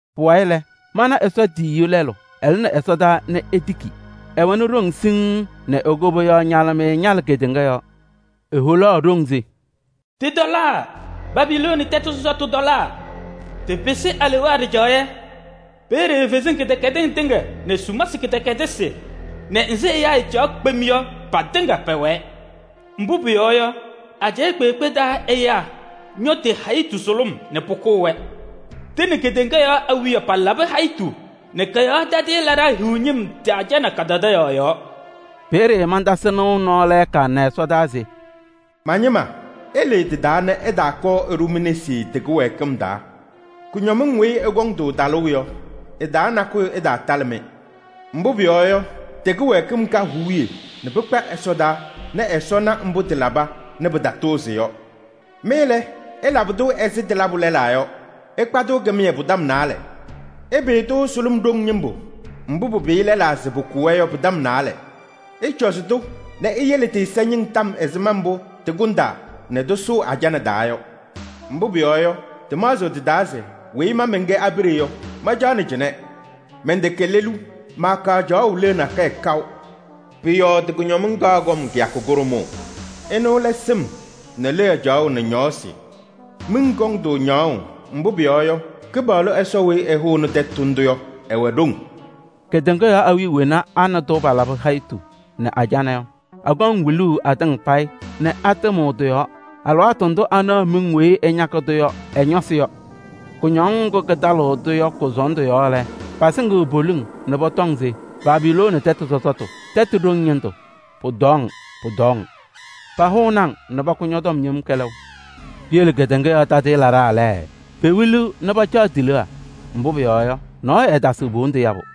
Pʋwayɩ lɛ, mana Ɛsɔ tiyiyu lɛlʋ, ɛlɩnɩ ɛsɔdaa nɛ etiki. Ɛwɛnɩ ɖoŋ siŋŋ nɛ e-koboyaɣ ñalɩmɩyɛ ñalɩ kedeŋa yɔɔ. Eholaɣ ɖoŋ se: “Tɩtɔlaa! Babilooni tɛtʋ sɔsɔtʋ tɔlaa! Tɩpɩsɩ alewaa ɖɩjaɣyɛ. Peeye kalɩzasɩ kɩdɛkɛdɩsɩ tɩŋa nɛ sumasɩ kɩdɛkɛdɩsɩ nɛ nzɩ ɛyaa ɛɛcaɣ kpem yɔ patɩŋa pɛwɛɛ. Mbʋ pʋyɔɔ yɔ, ajɛɛ kpeekpe taa ɛyaa ñɔ tɩ-hayitu sʋlʋm nɛ pʋkʋʋ-wɛ. Tɩ nɛ kedeŋa yɔɔ awiya palabɩ hayitu nɛ kɔ-yɔɔ tadɩyɛ laɖaa hiɣ ñɩm tɩ-ajana kadadaɣyaɣ yɔɔ.” Peeye mantasɩ nɩʋ nɔɔ lɛɛka nɛ ɛsɔdaa se: “Ma-ñɩma! Ɩlɩɩ tɩ-taa nɛ ɩtaakɔɔ ɩɖʋ mi-nesi tɩ-kɩwɛɛkɩm taa. Kʋñɔmɩŋ weyi ɩkɔŋ-tʋ talʋʋ yɔ, ɩ-taa nakʋyʋ ɩtaatalɩ-mɩ. Mbʋ pʋyɔɔ yɔ, tɩ-kɩwɛɛkɩm ka huuye nɛ pɩkpa ɛsɔdaa nɛ Ɛsɔ na mbʋ tɩlaba nɛ pɩtatʋʋzɩ yɔ. Mɩ lɛ, ɩlabɩ-tʋ ɛzɩ tɩlabʋ lɛlaa yɔ, ɩkpa-tʋ kɩmɩyɛ pʋ-tɔm naalɛ. Ɩpɩyɩ-tʋ sʋlʋm ɖoŋ ñɩmbʋ mbʋ pɩpɩyɩ lɛlaa se pʋkʋ-wɛ yɔ pʋ-tɔm naalɛ. Ɩcɔzɩ-tʋ nɛ iyele tɩ-ɛza ñɩŋ tɔm ɛzɩma mbʋ tɩkʋndaa nɛ tɩsʋʋ ajana taa yɔ! Mbʋ pʋyɔɔ yɔ, tɩmaɣzɩɣ tɩ-taa se: ‘Weyi ma mɛnkɛ abiɖe yɔ, mancaɣnɩ cɩnɛ. Mɛntɛkɛ lelu, maakaɣ caɣʋ leɣa nakɛyɛ kaʋ.’ Pʋ-yɔɔ tɩ-kʋñɔmɩŋ kaɣ kɔm kɩyakʋ kʋɖʋmʋʋ. Ɩnʋ lɛ: sɩm nɛ leɣa caɣʋ nɛ ñɔɔsɩ. Miŋ kɔŋ-tʋ ñaɣʋʋ, mbʋ pʋyɔɔ yɔ, Kɩpaɣlʋ Ɛsɔ weyi ɛhʋnɩ tɛtʋ ndʋ yɔ, ɛwɛ ɖoŋ. “Kedeŋa yɔɔ awiya wena a nɛ tʋ palabɩ hayitu nɛ ajana yɔ, akɔŋ wiluu atɩŋa payɩ nɛ atɩmɩɣ tɩ-yɔɔ alɩwaatʋ ndʋ anaɣ miŋ weyi ɛñakɩ-tʋ yɔ ɛ-ñɔsɩ yɔ. Kʋñɔŋ ŋgʋ kɩtalɩɣ-tʋ yɔ kʋ-sɔɔndʋ yɔɔ lɛ, pasɩŋɩɣ poliŋ nɛ pɔtɔŋ se: ‘Babilooni tɛtʋ sɔsɔtʋ, tɛtʋ ɖoŋ ñɩndʋ, pʋtɔɔ-ŋ! Pʋtɔɔ-ŋ! Pahʋnɩ-ŋ nɛ pakʋ ñɔ-tɔm yem kɛlɛʋ!’ “Piyele kedeŋa yɔɔ tadɩyɛ laɖaa lɛ, pewiliɣ nɛ pacaɣ ti-leɣa. Mbʋ pʋyɔɔ yɔ, nɔɔyʋ ɛɛtasɩɣ po-wondu yabʋ.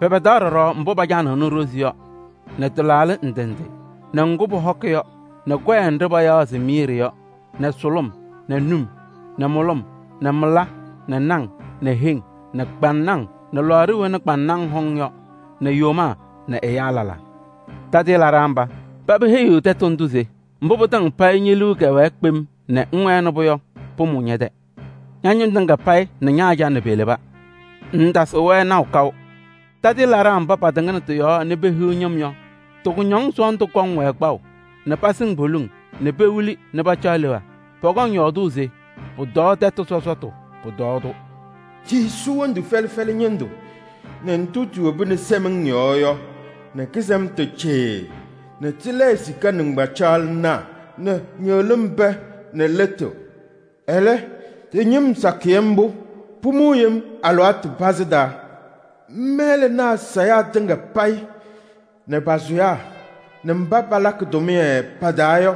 Pɛpɛdaɣ ɖɔɖɔ mbʋ pacanɩɣnɩ ɖozi yɔ nɛ tɩlaaɖɩ ndɩ ndɩ nɛ ŋgʋ pɔhɔkɩ yɔ nɛ kɔyɛ nɖɩ payaɣ se miiri yɔ nɛ sʋlʋm nɛ num nɛ mʋlʋm nɛ mɩla nɛ naŋ nɛ heŋ nɛ kpaŋnaŋ nɛ lɔɔɖa wena kpaŋnaŋ hɔŋ yɔ nɛ yomaa nɛ ɛyaa lɛlaa. Tadɩyɛ laɖaa mba, paba heyiɣ tɛtʋ ndʋ se: ‘Mbʋ pɩtɩŋa payɩ ñe-liu kɛwɛɛ kpem nɛ ŋwɛnɩ-pʋ yɔ, pʋmʋʋ ñɛ-tɛ. Ña-ñɩm tɩŋa payɩ nɛ ña-ajana peleba. Ŋŋtasɩɣ-wɛ naʋ kaʋ.’ Tadɩyɛ laɖaa mba pɩtɩŋnɩ tɩ-yɔɔ nɛ pehiɣ ñɩm yɔ, tɩ-kʋñɔŋ sɔɔndʋ kɔŋ-wɛ kpaʋ nɛ pasɩŋ poliŋ nɛ pewili nɛ pacaɣ leɣa. Pɔkɔŋ yɔɔdʋʋ se: ‘Pʋtɔɔ tɛtʋ sɔsɔtʋ! Pʋtɔɔ-tʋ! Tisu wondu fɛlɛ fɛlɛ ñɩndʋ nɛ ndʋ tiwobini sɛmɩŋ yɔɔ yɔ nɛ kɩsɛmtʋ cɩɩɩ nɛ tɩlɛɛ sika nɩŋgbacaɣlɩnaa nɛ ñɩɣlɩm pɛɛ nɛ lɩtʋ. Ɛlɛ tɩ-ñɩm sakɩyɛ mbʋ, pʋmʋʋ yem alɩwaatʋ pazɩ taa.’ “Mɛlɛnaa sayaa tɩŋa payɩ nɛ pa-sʋyaa nɛ mba palakɩ tʋmɩyɛ pa-taa yɔ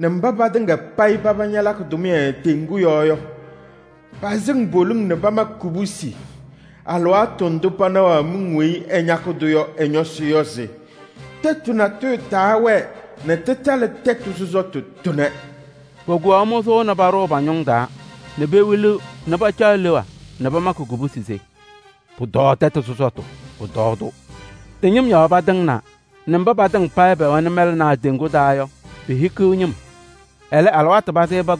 nɛ mba patɩŋa payɩ paba ñalakɩ tʋmɩyɛ teŋgu yɔɔ yɔ, pasɩŋ poliŋ nɛ pamakɩ kubusi alɩwaatʋ ndʋ panaɣaɣ miŋ weyi ɛñakɩ-tʋ yɔ ɛ-ñɔsɩ yɔ se: ‘Tɛtʋ natʋyʋ taawɛɛ nɛ tɩtalɩ tɛtʋ sɔsɔtʋ tʋnɛ!’ Pokuwaɣ mʋzʋʋ nɛ paɖʋʋ pa-ñʋŋ taa nɛ pewiliɣ nɛ pacaɣ leɣa nɛ pamakɩ kubusi se: ‘Pʋtɔɔ tɛtʋ sɔsɔtʋ! Pʋtɔɔ-tʋ! Tɩ-ñɩm yɔɔ pɩtɩŋaɣna nɛ mba patɩŋa payɩ pɛwɛnɩ mɛlɛnaa teŋgu taa yɔ, pehikiɣ ñɩm. Ɛlɛ tɩpɩsɩ yem alɩwaatʋ pazɩ taa!’”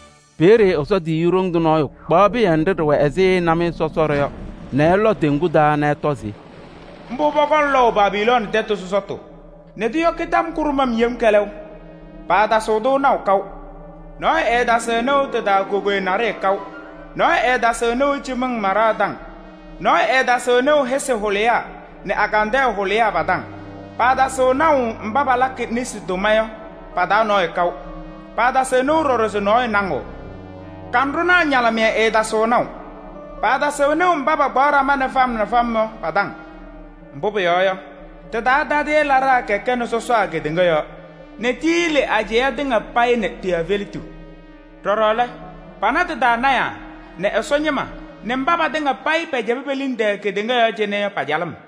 Peeye Ɛsɔ tiyiyu ɖoŋ tʋ nɔɔyʋ kpaɣ pɩyɛ nɖɩ ɖɩwɛ ɛzɩ namɩyɛ sɔsɔɖɛ yɔ nɛ ɛlɔ teŋgu taa nɛ ɛtɔ se: “Mbʋ pɔkɔŋ lɔʋ Babilooni tɛtʋ sɔsɔtʋ nɛ ɖoŋ nɛ paatasɩɣ-tʋ naʋ kaʋ. Nɔɔyʋ ɛɛtasɩɣ nɩʋ tɩ-taa cɩmɩŋ maɖaa nɛ soo maɖaa nɛ hɩsɩ hʋlɩyaa nɛ agandɛɛ hʋlɩyaa pa-taŋ. Paatasɩɣ naʋ mba palakɩ nesi tʋma yɔ pa-taa nɔɔyʋ kaʋ. Paatasɩɣ nɩʋ ɖɔɖɔ se nɔɔyʋ naŋɩɣ. Kanɖʋnaa ñalɩmɩyɛ ɛɛtasɩɣ naʋ. Paatasɩɣ nɩʋ mba pakpaɣ ɖama fam nɛ fam yɔ pa-taŋ. Mbʋ pʋyɔɔ yɔ, tɩ-taa tadɩyɛ laɖaa kɛkɛnɩ sɔsaa kedeŋa yɔɔ. Ɖɔɖɔ lɛ, tiyili ajɛɛ tɩŋa payɩ nɛ ti-efeletu nɛ pana tɩ-taa lɔɔyɩsɩ tɩnaa nɛ Ɛsɔ ñɩma nɛ mba patɩŋa payɩ pɛcɛbɩ pe-liŋ tɛɛ kedeŋa yɔɔ cɩnɛ yɔ pa-calɩm.”